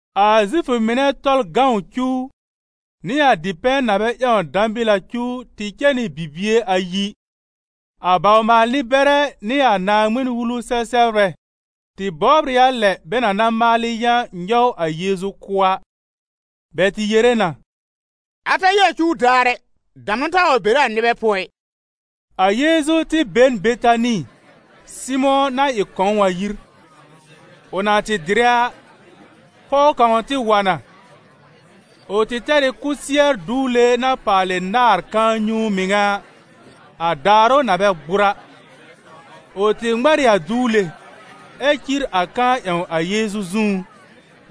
A Zifʋ mɩnɛ Tɔlʋ cuw, nɩ a dipɛ̃ na bɛ ƴãw dãbɩl a cuw tɩ cɛ nɩ bibie ayi. A bawr-maal-nɩ-bɛrɛ nɩ a Naaŋmɩn-Wulu-sɛ-sɛbrbɛ tɩ bɔbr ɩ a lɛ bɛ na na maalɩ yã nyɔw a Yeezu kʋ́ a. Bɛ tɩ yere na: «A ta ɩ a cuw daar ɛ, damnʋ taa wa bere a nɩbɛ pʋɔ ɩ!» A Yeezu tɩ be n Betani Sɩmʋ̃ na ɩ kɔ̃w a yir. Ʋ na tɩ dɩrɛ a, pɔw kãw tɩ wa na. Ʋ tɩ tɛr ɩ kʋsɩɛr duwle na paalɩ náàr kãa-nyũu mɩŋa, a daarʋ na bɛ gbʋr a. Ʋ tɩ ŋmɛr ɩ a duwle, ɛ cir a kãa ƴãw a Yeezu zũú.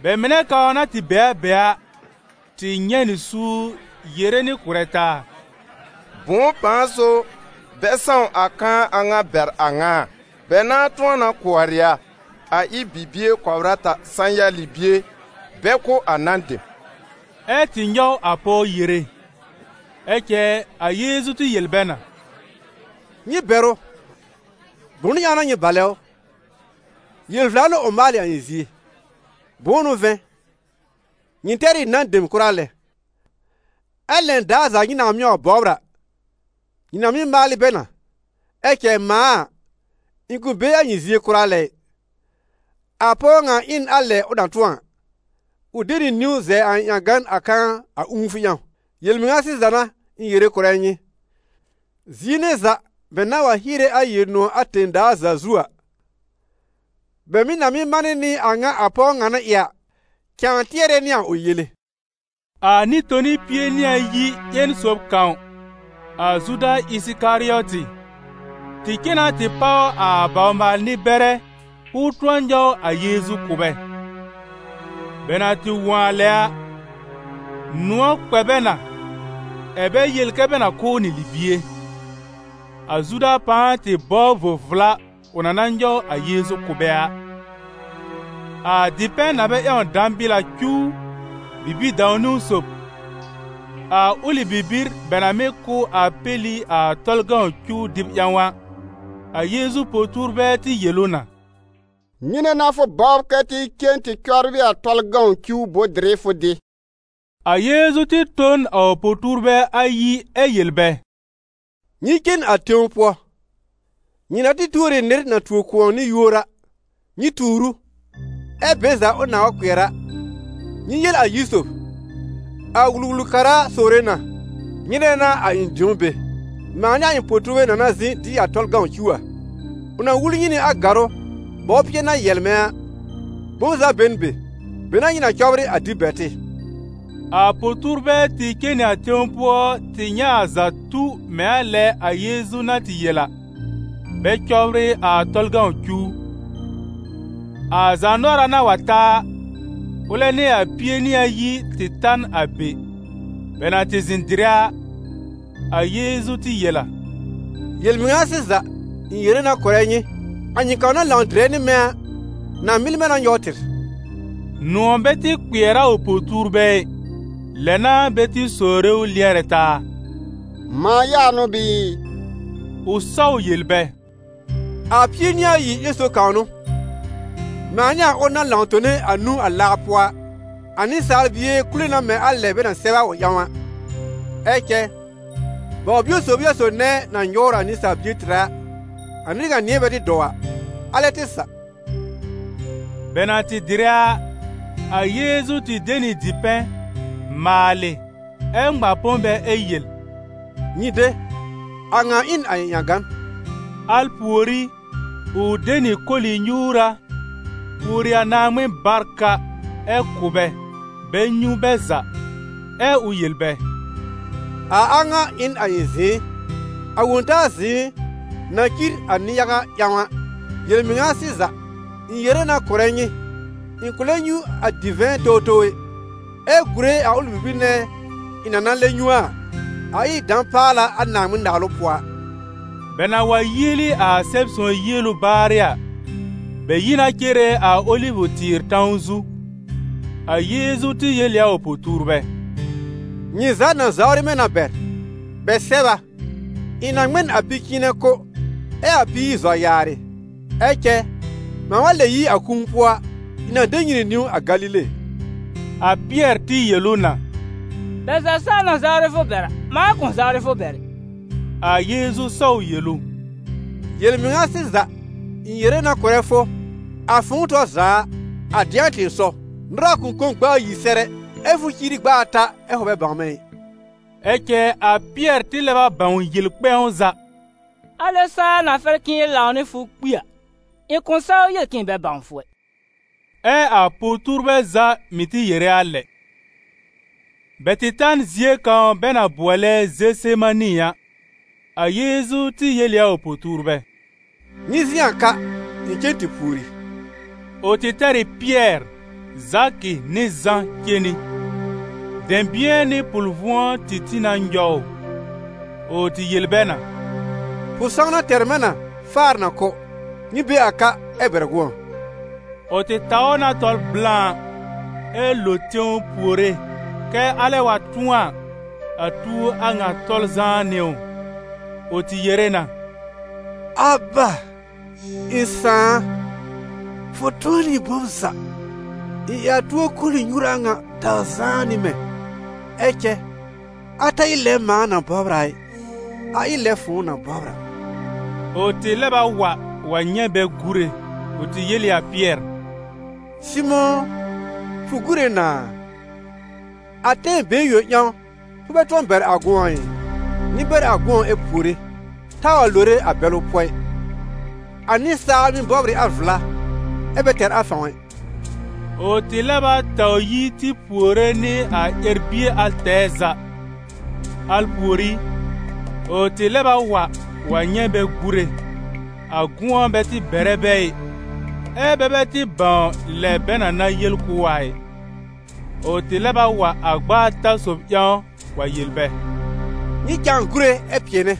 Bɛ mɩnɛ kãw na tɩ be a be a, tɩ nyɛ̃ nɩ suur yere nɩ kʋ̀rɛ taa: «Bʋ̃ʋ pãa so bɛ sãw a kãa a ŋa bɛr a ŋa a? Bɛ nãa tʋ̃ɔ na kʋɔrɩ a, a ɩ bibie kɔbr ata sã-ya libie, bɛ kʋ̀ a nan dem.» Ɛ́ tɩ nyɔw a pɔw yere. Ɛ cɛ a Yeezu tɩ yel bɛ na: «Nyɩ bɛr ʋ, bʋnʋ ƴãw n'a nyɩ balɛ ʋ? Yel-vla n'ʋ ʋ maalɩ a ɩ̃ zie. Bʋ̃ʋ n'ʋ vɛ̃, nyɩ tɛr ɩ a nan dem kʋra lɛ, ɛ lɛn daar za nyɩ nãa mɩ́ wa bɔbr a, nyɩ na mɩ́ maalɩ bɛ na; ɛ cɛ mãa a, ɩ̃ kʋ̃ be a nyɩ zie kʋra lɛ ɩ. A pɔw ŋa ɩ n a lɛ ʋ na tʋ̃ɔ a, ʋ de nɩ niwn zɛ a ɩ̃ ƴãgan a kãa a ũufʋ ƴãw. Yel-mɩŋa sɩza n'a ɩ̃ yere kʋ̀rɛ nyɩ: zie nɛ za bɛ nãa wa hiere a Yel-nʋ̃ɔ̀ a tẽ-daa za zu a, bɛ mɩ̀ na mɩ́ manɩ nɩ a a ŋa a pɔw ŋa na ɩ a, cãa tɩɛrɛ nɩ a ʋ yele.» A Nɩ-toni pie nɩ ayi ƴen sob kãw, a Zuda Ɩsɩkarɩɔtɩ, tɩ cen na tɩ páw a bawr-maal-nɩ-bɛrɛ k'ʋʋ tʋ̃ɔ nyɔw a Yeezu kʋ̀ bɛ. Bɛ na tɩ wõ a lɛ a, nʋ̃ɔ̀ kpɛ bɛ na, ɛ̀ bɛ yel kɛ́ bɛ na kʋ̀ ʋ nɩ libie. A Zuda pãa tɩ bɔbr vo-vla ʋ na na nyɔw a Yeezu kʋ̀ bɛ a. A dipɛ̃ na bɛ ƴãw dãbɩl a cuw bibi-dãw-niwn sob, a ʋlɩ bibir bɛ na mɩ́ kʋ́ a péli a Tɔlʋ cuw dɩb ƴãw a, a Yeezu po-tuurbɛ tɩ yel ʋ na: «Nyɩnɛ n'a fʋ bɔbr kɛ́ tɩ cen tɩ cɔbrɩ a Tɔlʋ cuw bʋ̃-dɩrɩ fʋ dɩ?» A Yeezu tɩ tõ n a ʋ po-tuurbɛ ayi ɛ yel bɛ: «Nyɩ cen a tẽw pʋɔ, nyɩ na tɩ tuor ɩ nɩr na tuo kʋ̃ɔ nɩ yúor a, nyɩ tuur ʋ, ɛ be za ʋ nãa wa kpɩɛr a, nyɩ yel a yir sob: ‹A Wul-wul-kara sowre na: nyɩnɛ n'a a ɩ̃ dĩo be, mãa nɩ a ɩ̃ po-tuurbɛ na na zɩ̃ dɩ a Tɔlʋ cuw a?› Ʋ na wul nyɩ nɩ a gàrʋ́, bɔwpɩɛ na yɛlmɛ̃ a, bom za be n be, be n'a nyɩ na cɔbrɩ a dɩb bɛr tɩ.» A po-tuurbɛ tɩ cen nɩ a tẽw pʋɔ tɩ nyɛ̃ a za tu mɛ̃ a lɛ a Yeezu na tɩ yel a, bɛ cɔbrɩ a Tɔlʋ cuw. A zaanʋɔra na wa ta a, ʋlɛ nɩ a Pie-nɩ-ayi tɩ ta n a be. Bɛ na tɩ zɩ̃ dɩrɛ a, a Yeezu tɩ yel a: «Yel-mɩŋa sɩza, ɩ̃ yere na kʋ̀rɛ nyɩ, a nyɩ kãw na lãw dɩrɛ nɩ mɛ̃ a, na mɩl mɛ̃ na nyɔw tɩr.» Nʋ̃ɔ̀ bɛ tɩ kpɩɛr a ʋ po-tuurbɛ ɩ, lɛ n'a bɛ tɩ sowre ʋ lɩɛrɛ taa: «Mãa ya n'ʋ bɩɩ?» Ʋ sɔw yel bɛ: «A Pie-nɩ-ayi ƴẽn sob kãw n'ʋ, mãa nɩ a ʋl na lãw tone a nũu a laa pʋɔ a. A Nɩsaal Bie kule na mɛ̃ a lɛ bɛ na sɛb a ʋ ƴãw a, ɛ cɛ baw-bio sob n'ɩ a sob nɛ na nyɔwr a Nɩsaal Bie tɩrɛ a, a nɩr ŋa nɩ̃ɛ bɛ tɩ dɔw a, alɛ tɩ sa.» Bɛ na tɩ dɩrɛ a, a Yeezu tɩ de nɩ dipɛ̃, maalɩ, ɛ́ ŋma põ bɛ ɛ yel: «Nyɩ de, a ŋa ɩ n a ɩ̃ ƴãgan.» Al pùorí, ʋ de nɩ koli-nyuura, pùori a Naaŋmɩn barka, ɛ kʋ̀ bɛ, bɛ nyũ bɛ za. Ɛ ʋ yel bɛ: «A a ŋa ɩ n a ɩ̃ zɩ̃ɩ, a Wõ-taa zɩ̃ɩ na cir a nɩ-yaga ƴãw a. Yel-mɩŋa sɩza, ɩ̃ yere na kʋ̀rɛ nyɩ, ɩ̃ kʋ̃ lɛb nyũ a divɛ̃ towtow ɛ, ɛ gùre a ʋlɩ bibir nɛ ɩ̃ na na lɛb nyũ a, a ɩ dã-paala a Naaŋmɩn-Naalʋ pʋɔ a.» Bɛ na wa yieli a Sɛb-sõw yielu baarɩ a, bɛ yi na cere a Olivʋ-tɩɩr tãw zu. A Yeezu tɩ yel ɩ a ʋ po-tuurbɛ: «Nyɩ za na zawrɩ mɛ̃ na bɛr. Bɛ sɛb a: ‹Ɩ̃ na ŋmɛ n a pi-cɩ̃ɩnɛ kʋ́, ɛ a píir zɔ yaarɩ.› Ɛ cɛ mãa wa lɛ yi a kũu pʋɔ a, ɩ̃ na de nyɩ nɩ niwn a Galile.» A Pɩɛr tɩ yel ʋ na: «Bɛ za saa na zawrɩ fʋ bɛr a, mãa kʋ̃ zawrɩ fʋ bɛr ɛ.» A Yeezu sɔw yel ʋ: «Yel-mɩŋa sɩza, ɩ̃ yere na kʋrɛ fʋ, a fʋ̃ʋ tɔr za a, a dɩ̃a tɩ̃ɩsɔw, nʋra kʋ̃ kõ gb'a ayi sɛr ɛ, ɛ fʋ ciiri gb'a ata ɛ fʋ bɛ bãw mɛ̃ ɩ.» Ɛ cɛ a Pɩɛr tɩ lɛb a bãw yel kpɛ̃w za: «Alɛ saa na fɛr k'ɩ̃ɩ lãw nɩ fʋ kpi a, ɩ̃ kʋ̃ saw yel k'ɩ̃ɩ bɛ bãw fʋ ɛ.» Ɛ a po-tuurbɛ za mɩ̀ tɩ yere a lɛ. Bɛ tɩ ta n zie kãw bɛ na bʋɔlɛ Zesemani a. A Yeezu tɩ yel ɩ a ʋ po-tuurbɛ: «Nyɩ zɩ̃ a ka, ɩ̃ cen tɩ pùori.» Ʋ tɩ tɛr ɩ Pɩɛr, Zakɩ nɩ Zã cen nɩ. Dɛ̃bɩ̃ɛ nɩ pʋl-vʋ̃ɔ tɩ tĩ na nyɔw ʋ. Ʋ tɩ yel bɛ na: «Pʋ-sãwna tɛr mɛ̃ na faar na kʋ́. Nyɩ be a ka ɛ bɛr gʋ̃ɔ.» Ʋ tɩ taw na tɔl blã, ɛ́ lo tẽw puore kɛ alɛ wa tʋ̃ɔ a, a tuo a ŋa tɔl zãá nɩ ʋ. Ʋ tɩ yere na: «Aba, ɩ̃ Sãà a, fʋ tʋ̃ɔ nɩ bom za. Ɩ a tuo koli-nyuura ŋa taw zãá nɩ mɛ̃. Ɛ cɛ a ta ɩ lɛ a mãa na bɔbr a ɩ, a ɩ lɛ fʋ̃ʋ na bɔbr a.» Ʋ tɩ lɛb a wa wa nyɛ̃ bɛ gúre; ʋ tɩ yel ɩ a Pɩɛr: «Sɩmʋ̃ ʋ, fʋ gúre na a? A tɛm been yõ ƴãw fʋ bɛ tʋ̃ɔ bɛr a gʋ̃ɔ ɩ? Nyɩ bɛr gʋ̃ɔ ɛ puore, taa wa lore a bɛlʋ pʋɔ ɩ, a nɩsaal mɩ́ bɔbr ɩ a vla ɛ bɛ tɛr a fãw ɛ.» Ʋ tɩ lɛb a taw yi tɩ puore nɩ a ƴɛr-bie al tɛɛ za. Al pùorí, ʋ tɩ lɛb a wa wa nyɛ̃ bɛ gúre, a gʋ̃ɔ bɛ tɩ bɛrɛ bɛ ɩ, ɛ́ bɛ bɛ tɩ bãw lɛ bɛ na na yel kʋ̀ ʋ a ɩ. Ʋ tɩ lɛb a wa a gb'a ata sob ƴãw wa yel bɛ: «Nyɩ cãa gúre ɛ pɩɛnɛ.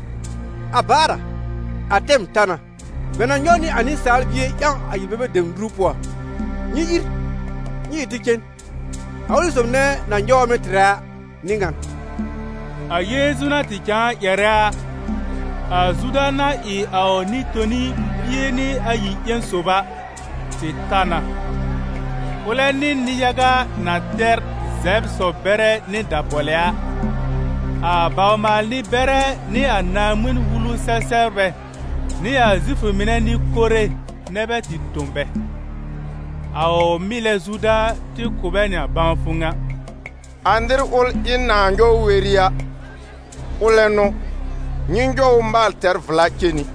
A baar a, a tɛm ta na: bɛ na nyɔw nɩ a Nɩsaal Bie ƴãw a yel-bebe dem nuru pʋɔ. Nyɩ ìr, nyɩ ɩ tɩ cen, a ʋlɩ sob nɛ na nyɔwr mɛ̃ tɩrɛ a n'ɩ ŋan.» A Yeezu na tɩ cãa ƴɛrɛ a, a Zuda na ɩ a ʋ Nɩ-toni pie nɩ ayi ƴẽn sob a, tɩ ta na, ʋlɛ nɩ nɩ-yaga na tɛr zɛbr sɔ-bɛrɛ nɩ dabɔlɛ a. A bawr-maal-nɩ-bɛrɛ nɩ a Naaŋmɩn-wulu sɛ-sɛbrbɛ nɩ a Zifʋ mɩnɛ nɩ-kore nɛ bɛ tɩ tõ bɛ. A ʋ mɩlɛ Zuda tɩ kʋ̀ bɛ nɩ bãwfʋ ŋa: «A nɩr ʋl ɩ̃ nãa nyɔw weri a, ʋlɛ n'ʋ, nyɩ nyɔw ʋ maal tɛr vla cen nɩ.»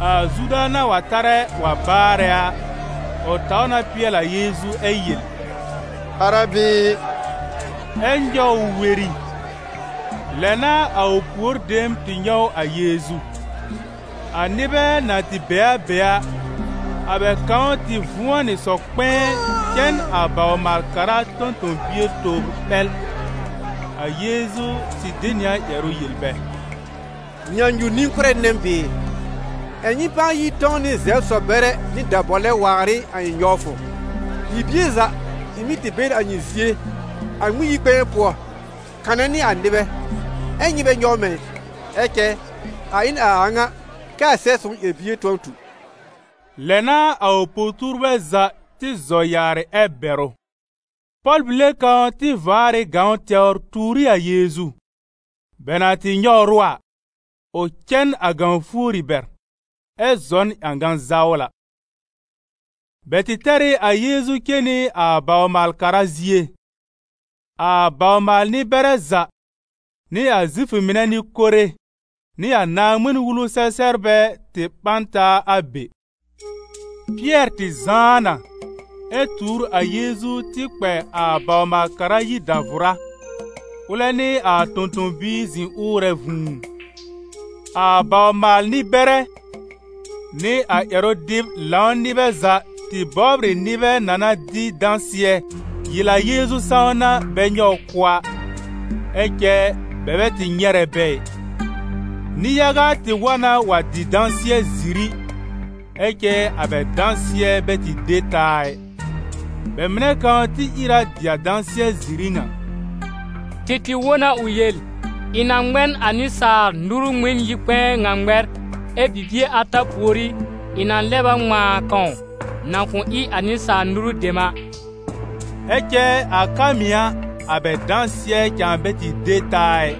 A Zuda na wa tarɛ wa baarɛ a, ʋ taw na pɩɛl a Yeezu ɛ yel: «Arabi i!» Ɛ nyɔw ʋ weri. Lɛ n'a a ʋ pùor dem tɩ nyɔw a Yeezu. A nɩbɛ na tɩ be a be a, a bɛ kãw tɩ vʋ̃ɔ nɩ sɔ-kpɛ̃ɛ cɛ n a bawr-maal-kara tõ-tõ-bie tobr ɓɛl. A Yeezu tɩ de nɩ a ƴɛrʋ yel bɛ: «Nyãnyu-nɩ-kʋ́rɛ nɛ m bɩɩ, ɛ̀ nyɩ pãa yi tɔ̃w nɩ zɛbr sɔ-bɛrɛ nɩ dabɔlɛ waar ɩ a ɩ̃ nyɔwfʋ? Bibie za ɩ̃ mɩ́ tɩ be n a nyɩ zie, a Ŋmɩn-yi-kpɛ̃ɛ pʋɔ, kanɛ nɩ a nɩbɛ, ɛ́ nyɩ bɛ nyɔw mɛ̃ ɩ. Ɛ cɛ a ɩ n a a ŋa, kɛ a Sɛb-sõw ƴɛr-bie tʋ̃ɔ tu.» Lɛ n'a a ʋ po-tuurbɛ za tɩ zɔ yaarɩ ɛ bɛr ʋ. Pɔl-bile kãw tɩ vaar ɩ gãw tɛwr tuur ɩ a Yeezu. Bɛ na tɩ nyɔwr ʋ a, ʋ cɛ n a gãw fuori bɛr, ɛ zɔ n ƴãga-zawla. Bɛ tɩ tɛr ɩ a Yeezu cen nɩ a bawr-maal-kara zie. A bawr-maal-nɩ-bɛrɛ za, nɩ a Zifʋ mɩnɛ nɩ-kore nɩ a Naaŋmɩn-wulu-sɛ-sɛbrbɛ tɩ ɓã n taa a be. Pɩɛr tɩ zãá na, ɛ tuur a Yeezu tɩ kpɛ a bawr-maal-kara yir dàvʋrá, ʋlɛ nɩ a tõ-tõ-biir zɩ̃ ʋʋrɛ vũu. A bawr-maal-nɩ-bɛrɛ, nɩ a ƴɛrʋ-dɩb-lãw nɩbɛ za tɩ bɔbr ɩ nɩbɛ na na dɩ dãsɩɛ yel a Yeezu sãwna bɛ nyɔw ʋ kʋ́ a, ɛ cɛ bɛ bɛ tɩ nyɛrɛ bɛ ɩ. Nɩ-yaga tɩ wa na wa dɩ dãsɩɛ-ziri, ɛ cɛ a bɛ dãsɩɛ bɛ tɩ de taa ɩ. Bɛ mɩnɛ kãw tɩ ìr a dɩ a dãsɩɛ-ziri ŋa: «Tɩ tɩ wõ na ʋ yel: ‹Ɩ̃ na ŋmɛ n a nɩsaal nuru Ŋmɩn-yi-kpɛ̃ɛ ŋa ŋmɛr, ɛ bibie ata pùorí, ɩ̃ na lɛb a ŋmãa kãw na kʋ̃ ɩ a nɩsaal nuru dem a.›» Ɛ cɛ a ka mɩ̀ a, a bɛ dãsɩɛ cãa bɛ tɩ de taa ɩ.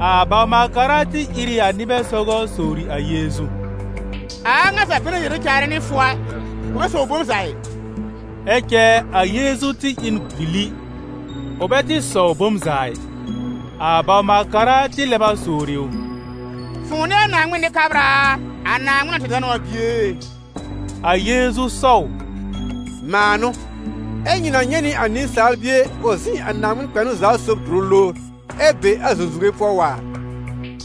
A bawr-maal-kara tɩ ìr ɩ a nɩbɛ sɔgɔ sowri a Yeezu: «A a ŋa za bɛ na yere caarɛ nɩ fʋ a, fʋ bɛ sɔwr bom za ɩ?» Ɛ cɛ a Yeezu tɩ ɩ n gbili, ʋ bɛ tɩ sɔw bom za ɩ. A bawr-maal-kara tɩ lɛb a sowri ʋ: «Fʋ̃ʋ n'ɩ a Naaŋmɩn Nɩ-kabra a, a Naaŋmɩn na tɛr danʋ a Bie e?» A Yeezu sɔw: «Mãa n'ʋ, ɛ nyɩ na nyɛ̃ nɩ a Nɩsaal Bie ʋ zɩ̃ a Naaŋmɩn-kpɛnʋ-za-sob dʋrʋ lowr, ɛ be a zũzuwe pʋɔ waar.»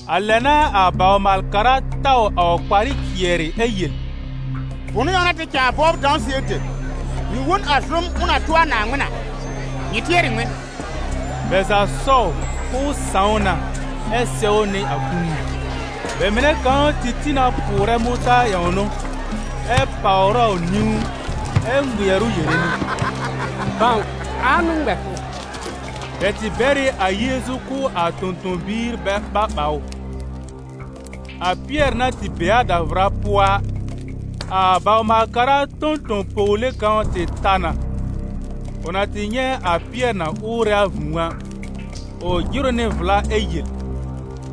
A lɛ n'a a bawr-maal-kara taw a ʋ kparɩ cɩɛrɩ ɛ yel: «Bʋnʋ ƴãw n'a tɩ cãa bɔbr dãsɩɛ dem? Nyɩ wõ n a zʋm ʋ na tʋ a Naaŋmɩn a. Nyɩ tɩɛr ɩ ŋmɩn?» Bɛ za sɔw k'ʋʋ sãw na ɛ sɛwnɩ a kũu. Bɛ mɩnɛ kãw tɩ tĩ na pʋʋrɛ mʋtaar ƴãwn ʋ, ɛ pàwr ʋ a nĩwn, ɛ ŋmɩɛr ʋ yere nɩ: «Bãw, ãa n'ʋ ŋmɛ fʋ.» Bɛ tɩ bɛr ɩ a Yeezu kʋ̀ a tõ-tõ-biir bɛ ɓa ɓa ʋ. A Pɩɛr na tɩ be a davʋra pʋɔ a, a bawr-maal-kara tõ-tõ-pɔwle kãw tɩ ta na. Ʋ na tɩ nyɛ̃ a Pɩɛr na ʋʋrɛ a vũu a, ʋ jɩr ʋ nɩ vla ɛ yel ʋ: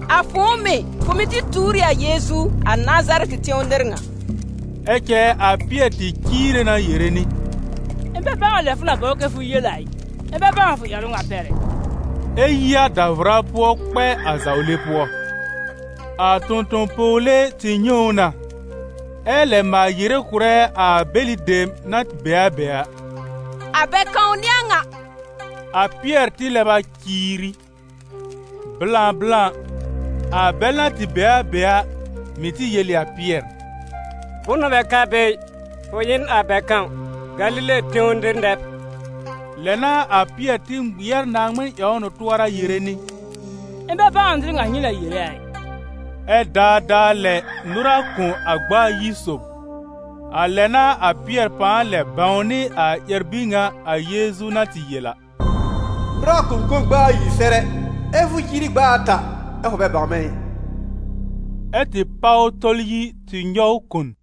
«A fʋ̃ʋ mɩ̀, fʋ mɩ̀ tɩ tuur ɩ a Yeezu, a Nazarɛtɩ tẽw nɩr ŋa.» Ɛ cɛ a Pɩɛr tɩ ciire na yere nɩ: «Ɩ̃ bɛ bãw a lɛ fʋ na bɔbr kɛ fʋ yel a ɩ, ɩ̃ bɛ bãw a fʋ ƴɛrʋ ŋa pɛr ɛ.» Ɛ yi a davʋra pʋɔ kpɛ a zawle pʋɔ. A tõ-tõ-pɔwle tɩ nyɛ̃ ʋ na, ɛ lɛb maal yere kʋ̀rɛ a bɛlɩ dem na tɩ be a be a: «A bɛ kãw n'ɩ a ŋa!» A Pɩɛr tɩ lɛb a ciiri. Blã blã, a bɛl na tɩ be a be a, mɩ̀ tɩ yel ɩ a Pɩɛr: «Bʋnʋ bɛ ka be ɩ, fʋ ɩ n a bɛ kãw: Galile tẽw nɩr nɛ b!» Lɛ n'a a Pɩɛr tɩ ŋmɩɛr Naaŋmɩn ƴãwn ʋ tʋɔra yere nɩ: «Ɩ̃ bɛ bãw a nɩr ŋa nyɩ na yere a ɩ.» Ɛ daadaa lɛ nʋra kõ a gb'a ayi sob. A lɛ n'a a Pɩɛr pãa lɛb bãwnɩ a ƴɛr-bir ŋa a Yeezu na tɩ yel a: «Nʋra kʋ̃ kõ gb'a ayi sɛr ɛ, ɛ fʋ ciiri gb'a ata ɛ fʋ bɛ bãw mɛ̃ ɩ.» Ɛ tɩ páw tɔl yi tɩ nyɔw kon.